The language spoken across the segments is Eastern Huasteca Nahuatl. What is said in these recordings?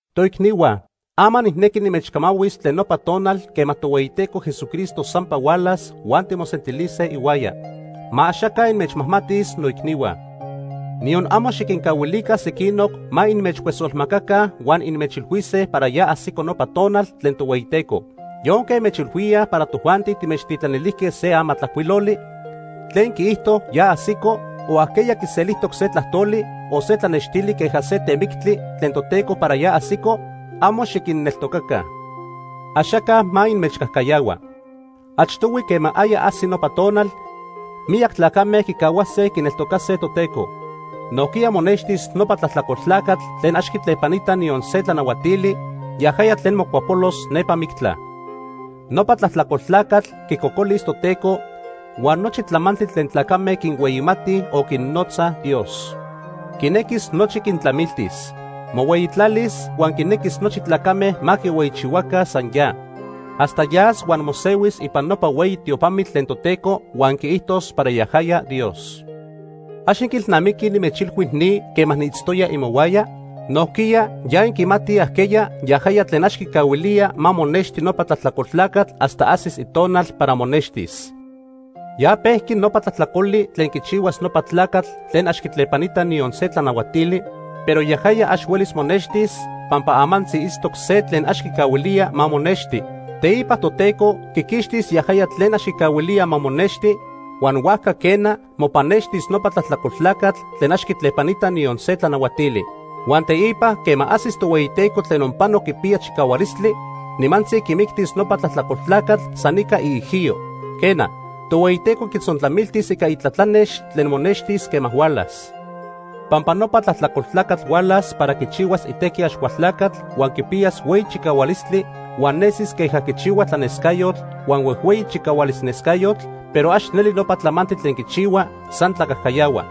Toicnihua, ama nijnequi nimechcamahuis tlen nopa tonal quema Tohueyiteco Jesucristo sampa hualas huan timosentilise ihuaya. Ma axaca inmechmajmatis, noicnihua. Niyon amo xiquincahuilica sequinoc ma inmechcuesolmacaca huan inmechilhuise para ya ajsico nopa tonal tlen Tohueyiteco. Yonque inmechilhuíaj para tojuanti timechtitlanilijque se amatlajcuiloli tlen quiijto ya ajsico, o ajqueya quiselijtoc se tlajtoli, o se tlanextili queja se temictli tlen Toteco para ya ajsico, amo xiquinneltocaca. Axaca ma inmechcajcayahua. Achtohui, quema aya ajsi nopa tonal, miyac tlacame quicahuase quineltocase Toteco. Nojquiya monextis nopa tlajtlacol tlacatl tlen ax quitlepanita niyon se tlanahuatili, yajaya tlen mocuapolos nepa mictla. Nopa tlajtlacol tlacatl quicocolis Toteco huan nochi tlamantli tlen tlacame quinhueyimatij o quinnotzaj “dios”. Quinequis nochi quintlamiltis. Mohueyitlalis huan quinequis nochi tlacame ma quihueyichihuaca san ya. Hasta yas huan mosehuis ipan nopa hueyi tiopamitl tlen Toteco huan quiijtos para yajaya Dios. ¿Ax inquiilnamiquij nimechilhui ni quema niitztoya imohuaya? Nojquiya ya inquimatij ajqueya yajaya tlen ax quicahuilía ma monexti nopa tlajtlacol tlacatl hasta ajsis itonal para monextis. Ya pejqui nopa tlajtlacoli tlen quichihuas nopa tlacatl tlen ax quitlepanita niyon se tlanahuatili, pero yajaya ax huelis monextis, pampa amantzi itztoc se tlen ax quicahuilía ma monexti. Teipa Toteco quiquixtis yajaya tlen ax quicahuilía ma monexti, huan huajca quena, mopannextis nopa tlajtlacol tlacatl tlen ax quitlepanita niyon se tlanahuatili. Huan teipa, quema ajsis Tohueyiteco tlen onpano quipiya chicahualistli, nimantzi quimictis nopa tlajtlacol tlacatl san ica iijiyo. Quena, Tohueyiteco quitzontlamiltis ica itlatlanex tlen monextis quema hualas. Pampa nopa tlajtlacol tlacatl hualas para quichihuas itequi Axcualtlacatl, huan quipiyas hueyi chicahualistli, huan nesis queja quichihua tlanescayotl huan huejhueyi chicahualis nescayotl, pero ax neli nopa tlamantli tlen quichihua, san tlacajcayahua.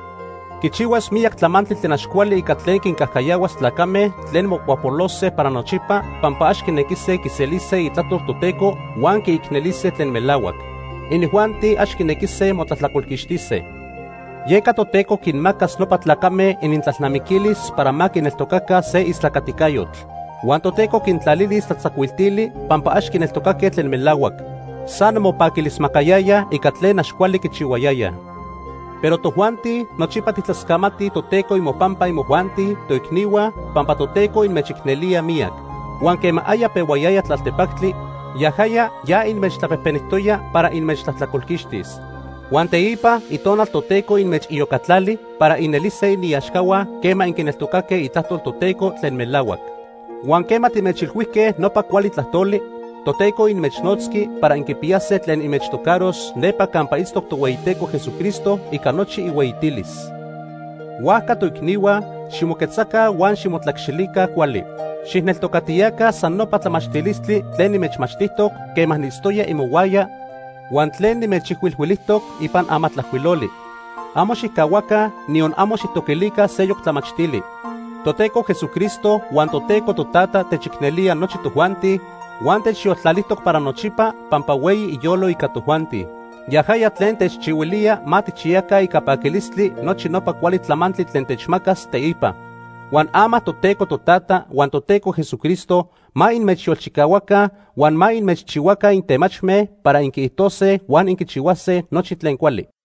Quichihuas miyac tlamantli tlen ax cuali ica tlen quincajcayahuas tlacame tlen mocuapolose para nochipa pampa ax quinequise quiselise itlajtol Toteco huan quiicnelise tlen melahuac. Inijuanti ax quinequise motlajtlacolquixtise. Yeca Toteco quinmacas nopa tlacame inintlalnamiquilis para ma quineltocaca se istlacaticayotl. Huan Toteco quintlalilis tlatzacuiltili pampa ax quineltocaque tlen melahuac. San mopaquilismacayayaj ica tlen ax cuali quichihuayayaj. Pero tojuanti, nochipa tijtlascamatij Toteco imopampa imojuanti, toicnihua, pampa Toteco inmechicnelía miyac. Huan quema aya pehuayaya tlaltepactli, yajaya ya inmechtlapejpenijtoya para inmechtlajtlacolquixtis. Huan teipa Itonal Toteco inmechiyocatlali para inelise iniaxcahua quema inquineltocaque itlajtol Toteco tlen melahuac. Huan quema timechilhuijque nopa cuali tlajtoli, Toteco inmechnotzqui para inquipiyase tlen inmechtocaros nepa campa itztoc Tohueyiteco Jesucristo ica nochi ihueyitilis. Huajca, toicnihua, ximoquetzaca huan ximotlacxilica cuali. Xijneltocatiyaca san nopa tlamachtilistli tlen nimechmachtijtoc quema niitztoya imohuaya huan tlen nimechijcuilhuilijtoc ipan amatlajcuiloli. Amo xijcahuaca, niyon amo xijtoquilica seyoc tlamachtili. Toteco Jesucristo huan Toteco Totata techicnelía nochi tojuanti huan techyoltlalijtoc para nochipa pampa hueyi iyolo ica tojuanti. Yajaya tlen techchihuilía ma tijchiyaca ica paquilistli nochi nopa cuali tlamantli tlen techmacas teipa. Huan ama Toteco Totata huan Toteco Jesucristo ma inmechyolchicahuaca huan ma inmechchihuaca intemachme para inquiijtose huan inquichihuase nochi tlen cuali.